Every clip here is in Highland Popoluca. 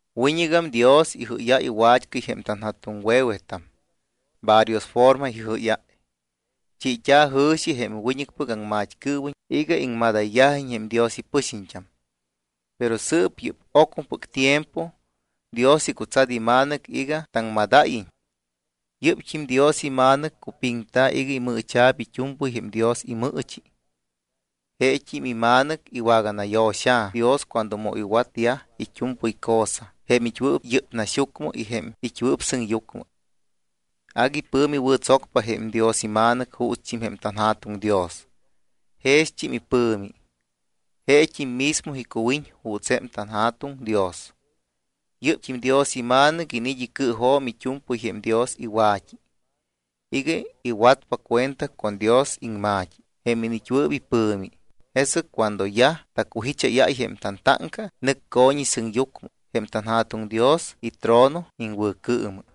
Wiñɨgam Dios ijɨ́yáy wat́cɨy jém tanja̱tuŋwe̱wetam. Varios forma ijɨ́yáy. Chiit́a̱ jɨ̱xi jém wiñɨcpɨc aŋmat́cɨɨwiñ iga iŋmadayyajiñ jém Dios ipɨxiñt́am. Pero sɨɨp yɨ́p ocmɨpɨc tiempo Dios icutsat iMa̱nɨc iga taŋmadáyiñ. Yɨ́pt́im Dios iMa̱nɨc cupiŋta̱ iga imɨɨcha̱p it́u̱mpɨy jém Dios imɨɨchi. Jeet́im iMa̱nɨc iwaganayo̱xa̱ Dios cuando mu iwatyaj it́u̱mpɨy cosa jém it́wɨɨp yɨ́p naxyucmɨ y jém it́wɨɨp sɨŋyucmɨ. Agui pɨ̱mi wɨ̱tsocpa jém Dios iMa̱nɨc juutst́im jém tanJa̱tuŋ Dios. Jext́im ipɨ̱mi. Jeet́im mismo icuwiñ juuts jém tanJa̱tuŋ Dios. Yɨ́pt́im Dios iMa̱nɨc iniit́ icɨɨjo̱m it́u̱mpɨy jém Dios iwa̱t́i iga iwatpa cuenta con Dios iŋma̱t́i jém iniit́wɨɨp ipɨ̱mi. Jesɨc cuando yaj tacujicháyáy jém tantáŋca, nɨc co̱ñi sɨŋyucmɨ jém tanJa̱tuŋ Dios itrono iŋwɨ̱cɨɨmɨ.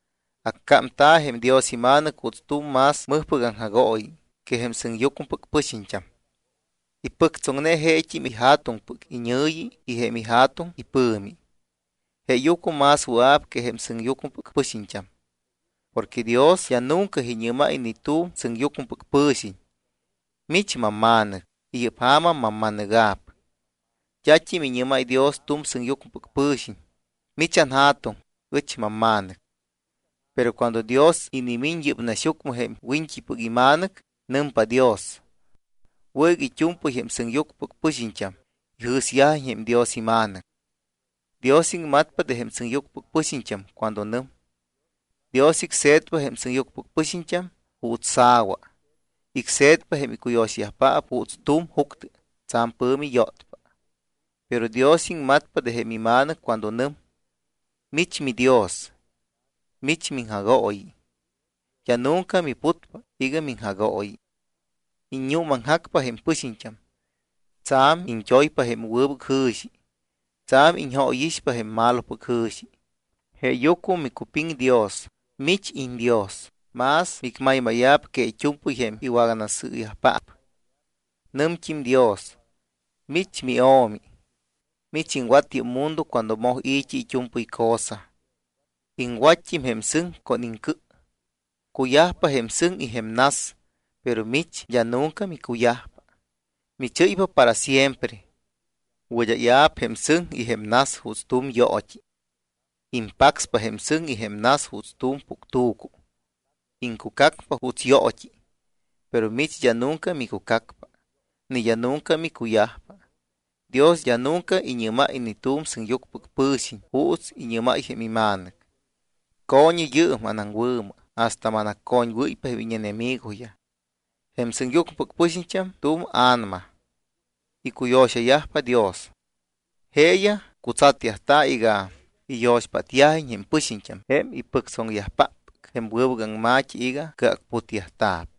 Accámta̱ jém Dios iMa̱nɨc juuts tu̱m más mɨjpɨc aŋjagooyi que jém sɨŋyucmɨpɨc pɨxiñt́am. Ipɨctsoŋne jeet́im iJa̱tuŋpɨc iñɨ̱yi y jém iJa̱tuŋ ipɨ̱mi, jeeyucmɨ más wɨa̱p que jém sɨŋyucmɨpɨc pɨxiñt́am. Porque Dios d́a nunca iñɨ́máy ni tu̱m sɨŋyucmɨpɨc pɨ̱xiñ: Mich mamMa̱nɨc. Yɨ́p ja̱ma mamma̱nɨga̱p. D́at́im iñɨ́máy Dios tu̱m sɨŋyucmɨpɨc pɨ̱xiñ: Mich anJa̱tuŋ, ɨch mamma̱nɨc. Pero cuando Dios inimiñ yɨ́p naxyucmɨ jém Wiñt́ipɨc iMa̱nɨc, nɨmpa Dios: Wɨ̱ iga it́u̱mpɨy jém sɨŋyucmɨpɨc pɨxiñt́am ijɨ̱syajiñ jém Dios iMa̱nɨc. Dios iŋmatpa de jém sɨŋyucmɨpɨc pɨxiñt́am cuando nɨm: Dios icse̱tpa jém sɨŋyucmɨpɨc pɨxiñt́am juuts sa̱wa. Icse̱tpa jém icuyo̱xayajpaap juuts tu̱m juctɨ tsa̱m pɨ̱mi yótpa. Pero Dios iŋmatpa de jém iMa̱nɨc cuando nɨm: Mich miDios. Mich miŋjagooyi. D́a nunca miputpa iga miŋjagooyi. Iññuumaŋjacpa jém pɨxiñt́am. Tsa̱m iñt́oypa jém wɨbɨc jɨ̱xi. Tsa̱m iñjóyixpa jém malopɨc jɨ̱xi. Jeeyucmɨ micupiŋ Dios, mich iñDios, más micmaymáya̱p que it́u̱mpɨy jém iŋwaganasɨɨyajpaap. Nɨmt́im Dios: Mich miO̱mi. Mich iŋwat yɨ́p mundo cuando moj i̱t́i it́u̱mpɨy cosa. Iŋwatt́im jém sɨŋ con iŋcɨ. Cuyajpa jém sɨŋ y jém nas, pero mich d́a nunca micuyajpa. Michɨ́ypa para siempre. Wɨd́áya̱p jém sɨŋ y jém nas juuts tu̱m yoot́i. Impacspa jém sɨŋ y jém nas juuts tu̱m puctu̱cu. Iŋcucacpa juuts yoot́i. Pero mich d́a nunca micucacpa. Ni d́a nunca micuyajpa. Dios d́a nunca iñɨ́máy ni tu̱m sɨŋyucmɨpɨc pɨ̱xiñ juuts iñɨ́máy jém iMa̱nɨc: Co̱ñɨ yɨɨm anaŋwɨ̱mɨ hasta que manaccoñwɨ́ypa jém íñenemigoyaj. Jém sɨŋyucmɨpɨc pɨxiñt́am tu̱m a̱nama. Icuyo̱xayajpa Dios. Jeeyaj cutsatyajta̱ iga iyo̱xpátyajiñ jém pɨxiñt́am jém ipɨctsoŋyajpáppɨc jém wɨbɨc aŋma̱t́i iga cɨacputyajta̱p.